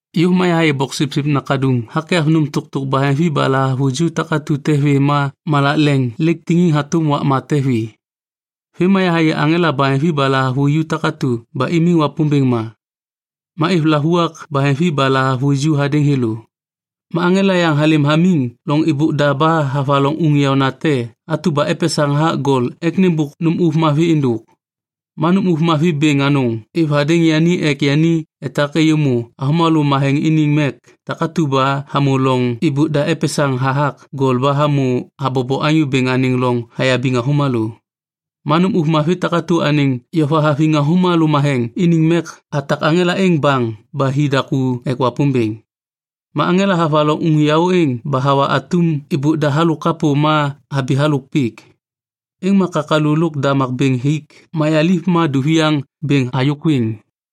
Yôv ma Boksipsip Nakaduŋ hakyav nôm tôktôk baheŋvi ba lahavuju takatu te vê ma malak leŋ lêk taktiŋ hatôm wakma te vi. Vêm ma yahayê aŋela baheŋvi ba lahavuju takatu ba imiŋ Wapômbêŋ ma. Ma êv lavuak baheŋvi ba lahavuju hadêŋ thêlô. Ma aŋela yaŋ halêm hamiŋ loŋ êbôk da ba havaloŋ uŋ yaônate atu ba epesaŋ hathak gol ek nêmbôk nôm ôv mavi êndôk. Ma nôm ôv mavi bêŋ anôŋ êv hadêŋ yani ek yani etak êyômô avômalô matheŋ iniŋ mek takatu ba hamô loŋ êbôk da epesaŋ hathak gol ba hamô habobo Anyô Bêŋ anêŋ loŋ hayabiŋ avômalô. Ma nôm ôv mavi takatu anêŋ yova haviŋ avômalô matheŋ iniŋ mek hatak aŋela êŋ baŋ ba hi daku ek Wapômbêŋ. Ma aŋela havaloŋ uŋ yaô êŋ ba hawa atum êbôk da halôk kapô ma habi halôk pik. Êŋ ma kakalu lôk damak bêŋ hik mayaliv ma duviaŋ bêŋ hayôkwiŋ.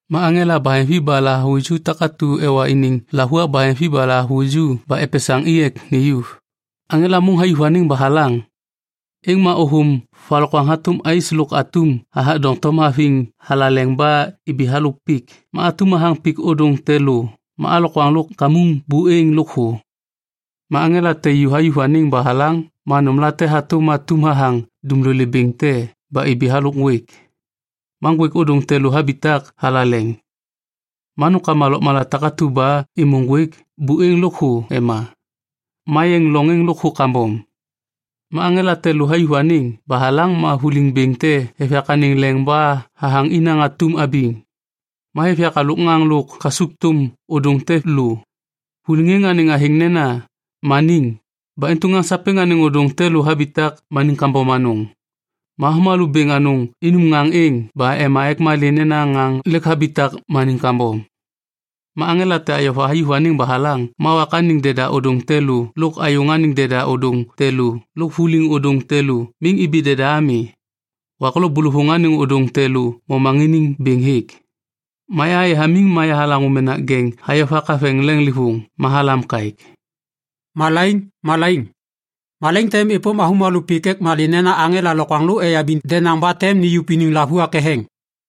Ma aŋela baheŋvi ba lahavuju takatu ewa iniŋ lavuak baheŋvi ba lahavuju ba epesaŋ i ek niyuv. Aŋela môŋ hayuv anêŋ ba halaŋ. Êŋ ma ôthôm valokwaŋ hatôm ais lôk atum hathak doŋtom haviŋ thalaleŋ ba ibi halôk pik ma atum hathaŋ pik ôdôŋ te lô ma alokwaŋ lôk kamuŋ buêŋ lôkthô. Ma aŋela te ju hayuv anêŋ ba halaŋ ma nômlate hatôm atum hathaŋ dumlolê bêŋ te ba ibi halôk ŋgwêk. Ma ŋgwêk ôdôŋ te lô habitak thalaleŋ. Ma nômkama lôkmala takatu ba êmô ŋgwêk buêŋ lôkthô ema, ma yeŋ loŋ êŋ lôkthô kambom. Ma aŋela te lô hayuv anêŋ ba halaŋ ma vuliŋ bêŋ te hêv yak anêŋ leŋ ba hathaŋ inaŋ atum abiŋ. Ma hêv yak halôk ŋaŋ lôk kasukthôm ôdôŋ te lô. Vuliŋ êŋ anêŋ athêŋ nena ‘Maniŋ’ ba intu ŋaŋ sapêŋ anêŋ ôdôŋ te lô habitak maniŋ kambom anôŋ. Ma avômalô bêŋ anôŋ inum ŋaŋ êŋ ba ema ek malê nena ŋaŋ lêk habitak maniŋ kambom. Ma aŋela te ayova hayuv anêŋ ba halaŋ ma wak anêŋ deda ôdôŋ te lô lôk ayôŋ anêŋ deda ôdôŋ te lô lôk vuliŋ ôdôŋ te lô miŋ ibi deda ami. Wak lo bôlôvôŋ anêŋ ôdôŋ te lô momaŋiniŋ bêŋ hêk. Ma yahayê hamiŋ ma yahalaŋô menak jeŋ hayovak haveŋ leŋlêvôŋ ma halam kaêk, “Malaiŋ, malaiŋ, malaiŋ tem êpôm avômalô pik ek malê nena aŋela lokwaŋlô eyabiŋ denaŋ ba tem niyuv iniŋ lavuak ketheŋ.”